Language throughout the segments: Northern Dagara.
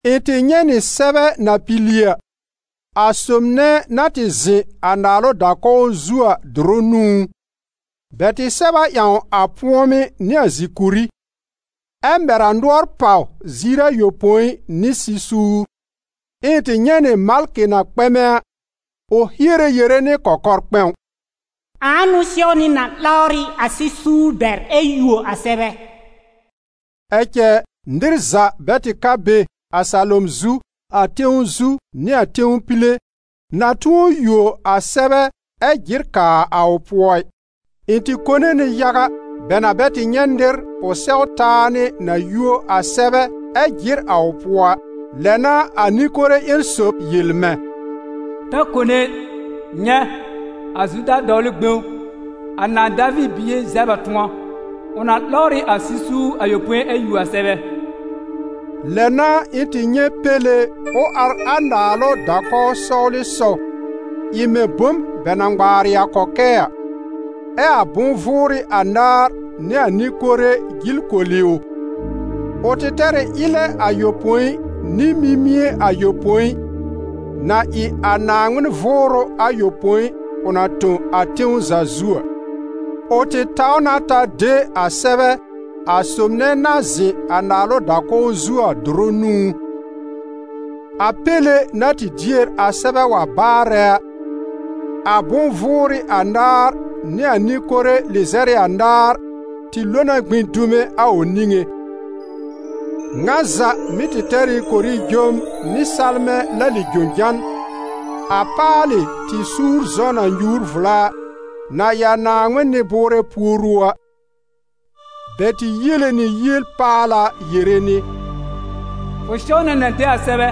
Ɩ̃ tɩ nyɛ̃ nɩ sɛbɛ na pili a, a sob nɛ na tɩ zɩ̃ a naalʋ da-kɔw zu a dʋrʋ nũú; bɛ tɩ sɛb a ƴãw a pʋ̃ɔmɩ́ nɩ a zìkùrí, ɛ mɛr a nʋɔr pàw ziir ayopõi nɩ sɩ-suur. Ɛ ɩ̃ tɩ nyɛ̃ nɩ malkɩ na kpɛmɛ a, ʋ hiere yere nɩ kɔkɔr-kpɛ̃w: «Ãa n'ʋ sɛwnɩ na 'lawrɩ a sɩ-suur bɛr ɛ yuo a sɛbɛ?» Ɛ cɛ, nɩr za bɛ tɩ ka be, a salom zu, a tẽw zu nɩ a tẽw pile, na tʋ̃ɔ yuo a sɛbɛ ɛ jɩr kaa a ʋ pʋɔ ɩ. Ɩ̃ tɩ kone nɩ yaga, bɛ na bɛ tɩ nyɛ̃ nɩr ʋ sɛw taa nɩ na yuo a sɛbɛ ɛ jɩr a ʋ pʋɔ a. Lɛ n'a a nɩ-kore ƴẽn sob yel mɛ̃: «Ta kone ɩ. Nyɛ̃, a Zuda dɔwlʋ gbẽw, a nãà Daviir bie zɛb a tʋ̃ɔ; ʋ na 'lawr ɩ a sɩ-suur ayopõi ɛ yuo a sɛbɛ.» Lɛ n'a ɩ̃ tɩ nyɛ̃ Péle ʋ ar a naalʋ da-kɔw sɔwlɩsɔw, ɩ mɛ̃ bom bɛ na ŋmaarɩ a kɔkɛɛ a, ɛ a bʋ̃-vʋʋrɩ anaar nɩ a nɩ-kore jil koli ʋ. Ʋ tɩ tɛr ɩ ɩlɛ ayopõi nɩ mimie ayopõi, na ɩ a Naaŋmɩn Vʋʋrʋ ayopõi ʋ na tõ a tẽw za zu a. Ʋ tɩ taw na ta de a sɛbɛ a sob nɛ na zɩ̃ a naalʋ da-kɔw zu a dʋrʋ nũú. A Péle na tɩ dier a sɛbɛ wa baarɛ a, a bʋ̃-vʋʋrɩ anaar nɩ a nɩ-kore lɩzɛr ɩ anaar tɩ lo na gbĩ dume a ʋ niŋé. Ŋa za mɩ́ tɩ tɛr ɩ korijom nɩ salmɛ̃ lali-jojan, a paalɩ tɩ-suur zɔ̃ na nyuur vla a, na ɩ a Naaŋmɩn nɩ-bʋʋrɛ puoru a. Bɛ tɩ yiele nɩ yiel-paala yere nɩ: «Fʋ sɛw na na de a sɛbɛ,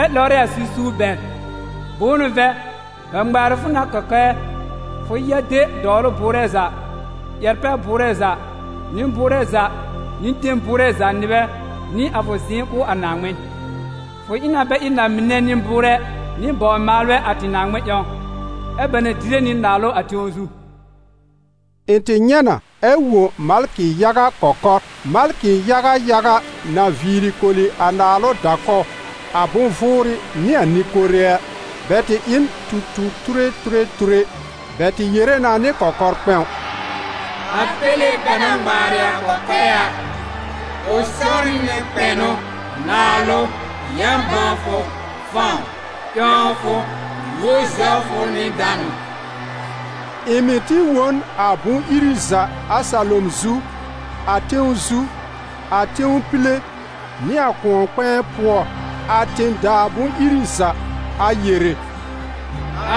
ɛ 'lawrɩ a sɩ-suur bɛr. Bʋ̃ʋ n'ʋ vɛ̃, bɛ ŋmaarɩ fʋ nɩ a kɔkɛɛ, fʋ ya de dɔwlʋ bʋʋrɛ za, ƴɛr-pɛ-bʋʋrɛ za, nɩ-bʋʋrɛ za nɩ ten bʋʋrɛ za nɩbɛ nɩ a fʋ zɩ̃ɩ kʋ̀ a Naaŋmɩn. Fʋ ɩ na bɛ ɩ na-mɩnɛ nɩ-bʋʋrɛ nɩ bawr-maalbɛ a tɩ Naaŋmɩn ƴãw, ɛ́ bɛ na dɩrɛ nɩ naalʋ a tẽw zu.» Ɩ̃ tɩ nyɛ̃ na ɛ wõ malkɩ yaga kɔkɔr. Malkɩ yaga yaga na viiri koli a naalʋ da-kɔw, a bʋ̃-vʋʋrɩ nɩ a nɩ-kore a. Bɛ tɩ ɩ n tu-tu-ture ture ture. Bɛ tɩ yere na nɩ kɔkɔr-kpɛ̃w: «A Péle bɛ na ŋmaarɩ a kɔkɛɛ a, ʋ sɛwnɩ nɩ kpɛnʋ, naalʋ, yã-bãwfʋ, fãw, ƴãwfʋ, yúor-zɛwfʋ nɩ danʋ!» Ɩ̃ mɩ̀ tɩ wõ n a bʋ̃-iri za a salom zu, a tẽw zu, a tẽw pile nɩ a kʋ̃ɔ-kpɛ̃ɛ pʋɔ, a tẽ-daa bʋ̃-iri za, a yere: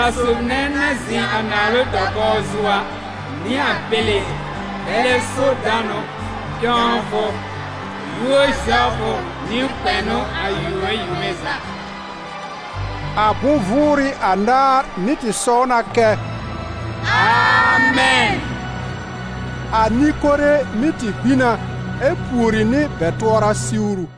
«A sob nɛ na zɩ̃ a naalʋ da-kɔw zu a, nɩ a Péle, bɛlɛ so danʋ, ƴãwfʋ, yúor-zɛwfʋ nɩ kpɛnʋ a yome yome za!» A bʋ̃-vʋʋrɩ anaar mɩ́ tɩ sɔw na kɛ: «Amɛn!» A nɩ-kore mɩ́ tɩ gbĩ na ɛ pùori nɩ bɛ tʋɔra siwru.